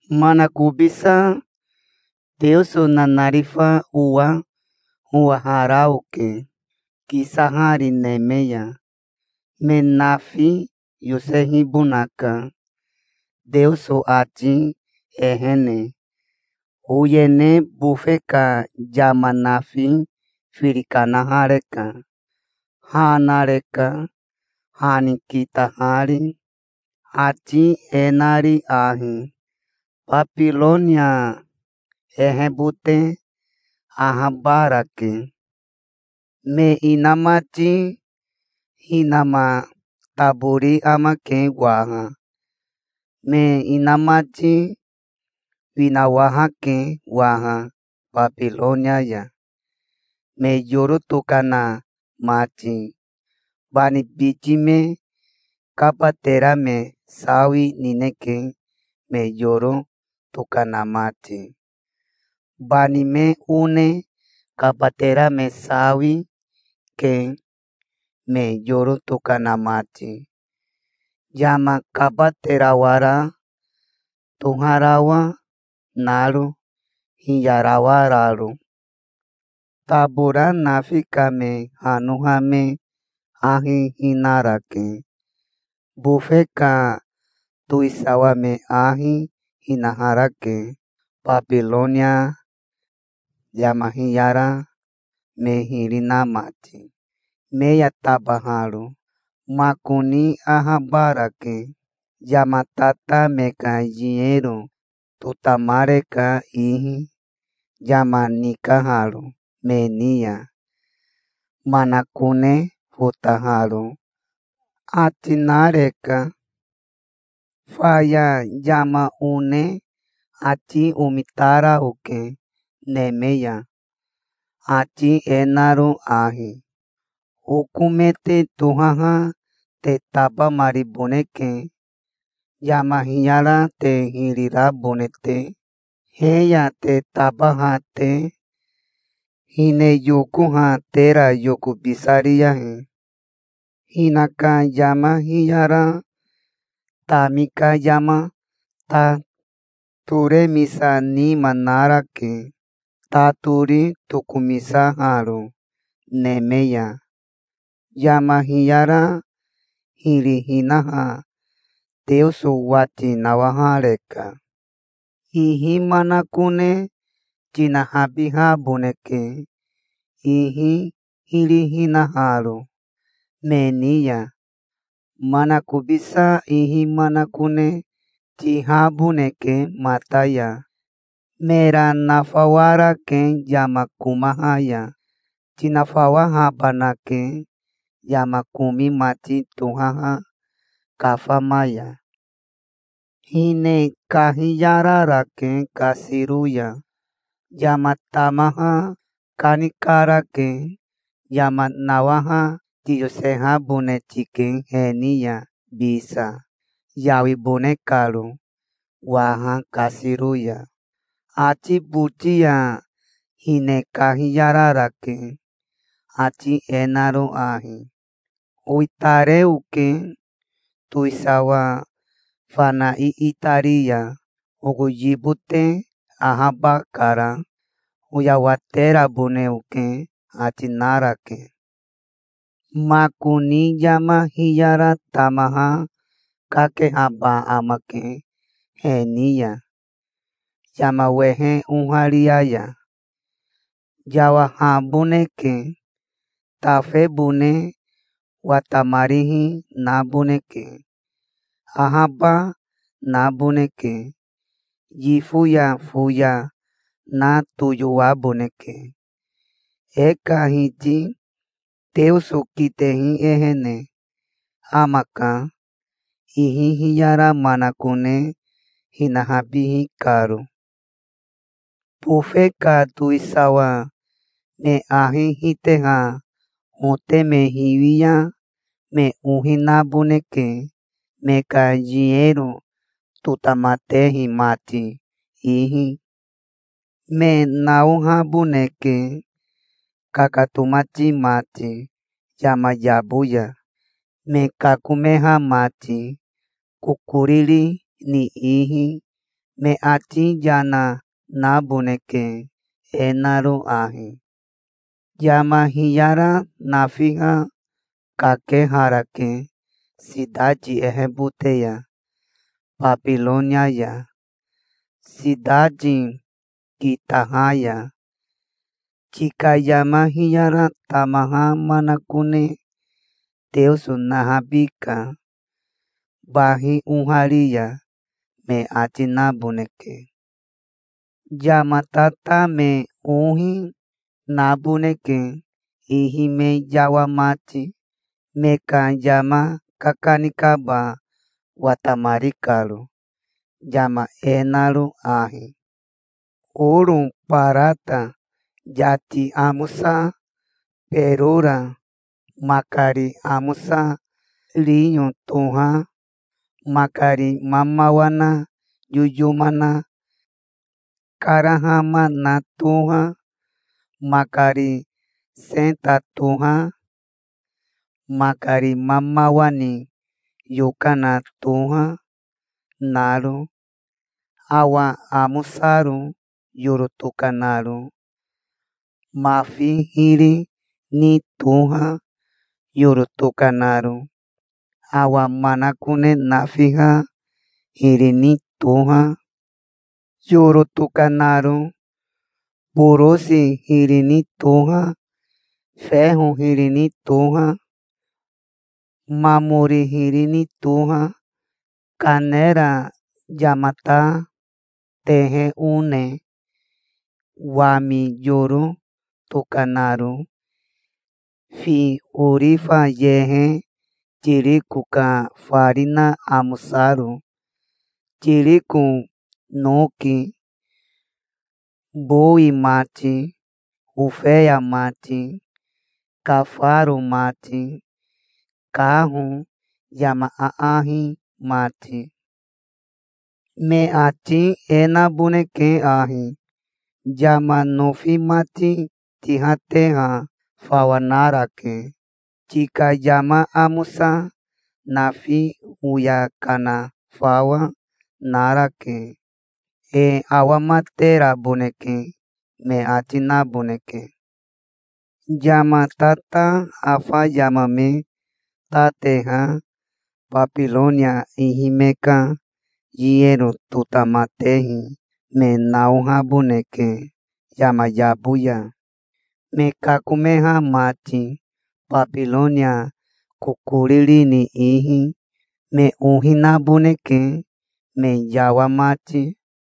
Manakobisa Teoso nanarifa owa owahara oke kisahari neme ya. Me nafi yosehibonaka Teoso ati ehene. Oyene bofe ka yama nafi firi kanahareka Ha nareka, ha ni kitahari, ati e nari ahi: "Babironia ehebote ahabarake. Me inamati hinama tabori amake waha. Me inamati winawahake waha Babironia ya, me yoro tokana mati. Bani biti me kabatera me sawi nineke me yoro tokana mati. Bani me one kabatera me sawi, ke, me yoro tokana mati, yama kabaterawara toharawa naro, hiyarawararo. Tabora nafi ka me hanoha me ahi hinarake. Bofe ka towisawa me ahi hinaharake, Babironia, yama hiyara me hiri na mati, me ya tabaharo. Makoni ahabarake. Yama tata me ka yinero totamareka ihi, yama nikaharo me ni ya, manakone fotaharo", ati nareka. Faya yama one ati omitara oke neme ya, ati e naro ahi: "Oko me te tohaha te tabamariboneke, yama hiyara te hiri rabone te, he ya te tabaha te. Hine yokoha tera yokobisariyahi. Hinaka yama hiyara tami ka yama ta toremisa nima narake, ta tori tokomisaharo neme ya. Yama hiyara hiri hinaha Teoso wati nawahareka. Ihi manakone tinahabihaboneke, ihi hiri hinaharo me ni ya. Manakobisa ihi manakone tihaboneke mata ya. Mera nafawarake yama komaha ya. Tinafawahabanake, yama komi mati tohaha kafama ya. Hine kahiyararake kasiro ya. Yama tamaha kanikarake. Yama nawaha tiyosehabone tike he ni ya, bisa, yawibone karo waha kasiro ya. Ati boti ya hine kahiyararake, ati e naro ahi: 'Owitare oke towisawa fana iitari ya. Oko yibote ahabakara. Oyawaterabone oke', ati narake. Makoni yama hiyara tamaha kakehaba amake he ni ya, yama wehe oharia ya. Yawahaboneke. Tafebone watamarihi naboneke. Ahaba naboneke. Yifo ya foya na toyowaboneke. E ka Hiti Teoso kitehi ehene amaka, ihi hiyara manakone hinahabihi karo". "Bofe ka towisawa me ahi hiteha hote me hiwi ya me ohi naboneke, me ka yinero totamatehi mati, ihi. Me naohaboneke, kakatomati mati yama yabo ya, me kakomeha mati, kokoriri ni ihi. Me ati yana naboneke, e naro ahi: 'Yama hiyara nafiha kakeharake sitati ehebote ya, Babironia ya, sitati kitaha ya. Tika yama hiyara tamaha manakone Teoso nahabika, bahi ohari ya', me ati naboneke". "Yama tata me ohi, naboneke ihi me yawa mati, me ka yama kakanikaba watamari karo, yama e naro ahi: oro, barata, yati amosa, berora, makari amosa riyo toha, makari mamawa na yoyoma karahama na toha, makari seta toha, makari mamawa ni yokana toha, naro, awa amosaro yoro tokanaro, mafi hiri ni toha, yoro tokanaro, awa manakone nafiha hiri ni toha, yoro tokanaro, borosi hiri ni toha, feho hiri ni toha, mamori hiri ni toha, kanera, yamata tehe one, wami yoro tokanaro, fi, orifa yehe, tiriko ka farina amosaro, tiriko noki, bowi mati, ofeya mati, kafaro mati, kaho, yama aahi mati. Me ati e naboneke ahi: 'Yama nofi mati tihateha fawa narake. Tika yama amosa nafi oya kana fawa, narake. E awamateraboneke', me ati naboneke". "Yama tata afa yama me ta teha Babironia ihi me ka yinero totamatehi me naohaboneke yama yabo ya, me kakomeha mati Babironia kokoriri ni ihi. Me ohi naboneke, me yawa mati.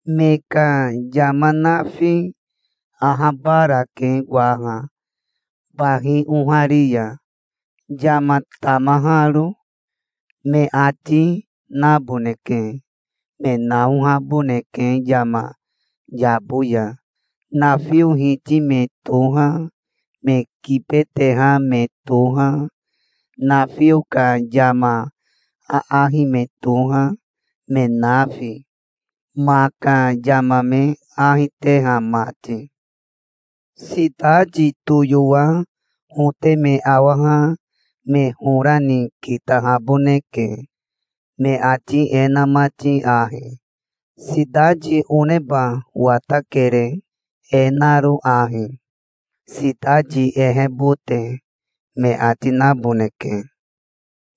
Me ka yama nafi ahabarake waha bahi ohari ya, yama tamaharo', me ati naboneke". "Me naohaboneke yama yabo ya, nafio hiti me toha, me kibeteha me toha, nafio ka yama aahi me toha, me nafi, ma ka yama me ahi teha mati. Sitati toyowa hote me awaha me hora ni kitahaboneke, me ati e na mati ahi: 'Sitati oneba watakere, e naro ahi, sitati ehebote', me ati naboneke.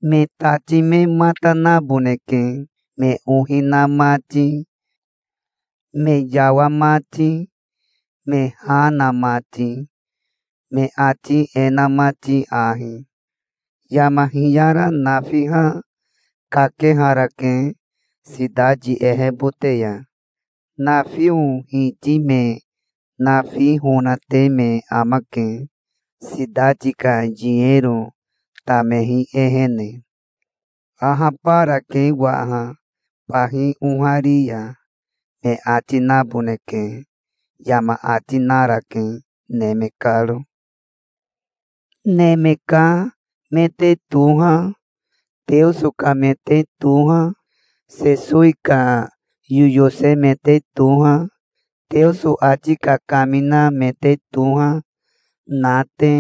Me tati me mata naboneke, me ohi na mati, me yawa mati, me ha na mati, me ati e na mati ahi: 'Yama hiyara nafiha kakeharake sitati ehebote ya. Nafio hiti me nafi honate me amake, sitati ka yinero tamehi ehene. Ahabarake waha, bahi ohari ya', me ati naboneke", yama ati narake neme karo. "Neme ka me te toha, Teoso ka me te toha, Sesowi ka yoyose me te toha, Teoso ati kakamina me te toha, na te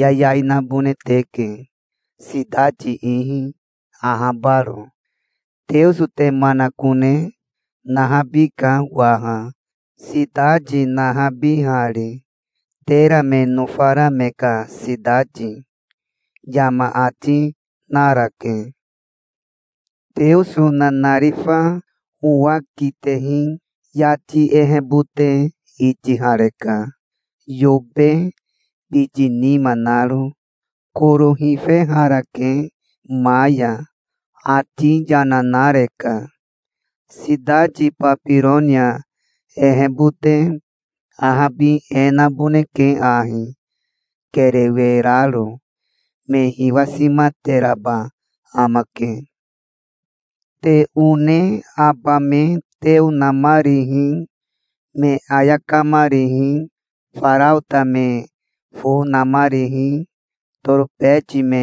yayai nabone teke, sitati ihi, ahabaro. Teoso te manakone nahabika waha, sitati nahabihari, tera me nofara me ka sitati", yama ati narake. Teoso nanarifa owa kitehi yati ehebote itihareka, yobe biti nima naro. Koro hifeharake ma ya. Ati yana nareka. "Sitati Babironia ehebote ahabi e naboneke ahi, kerewe raro. Me hiwasimateraba amake. Te one aba me teo namarihi, me ayakamarihi, faraota me fo namarihi, torobeti me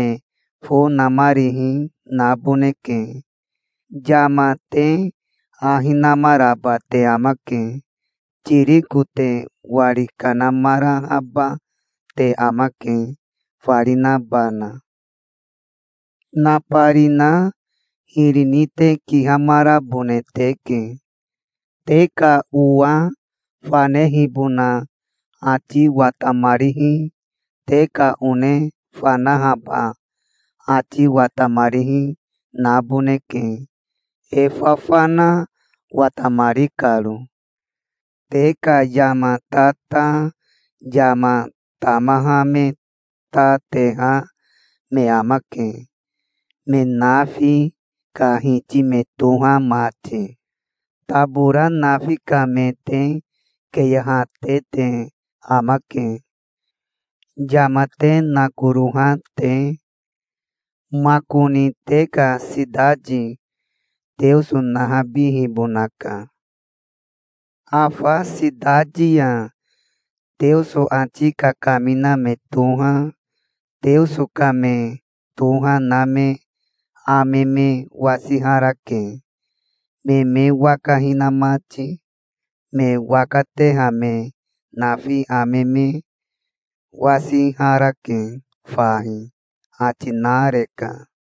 fo namarihi, naboneke. Yama te ahi namaraba te amake. Tiriko te wari kanamarahaba te amake, farinabana. Nabarina hiri ni te kihamarabone teke. Te ka owa fanehibona ati watamarihi, te ka one fanahaba ati watamarihi naboneke e fafana watamari karo. Te ka yama tata yama tamaha me ta teha me amake, me nafi ka hiti me toha mati. Tabora nafi ka me te keyehate te amake, yama te nakoroha te. Makoni te ka sitati Teoso nahabihibonaka. Afa sitati ya Teoso ati kakamina me toha, Teoso ka me toha na me ame me wasiharake, me me waka hina mati. Me waka teha me nafi ame me wasiharake fahi", ati nareka.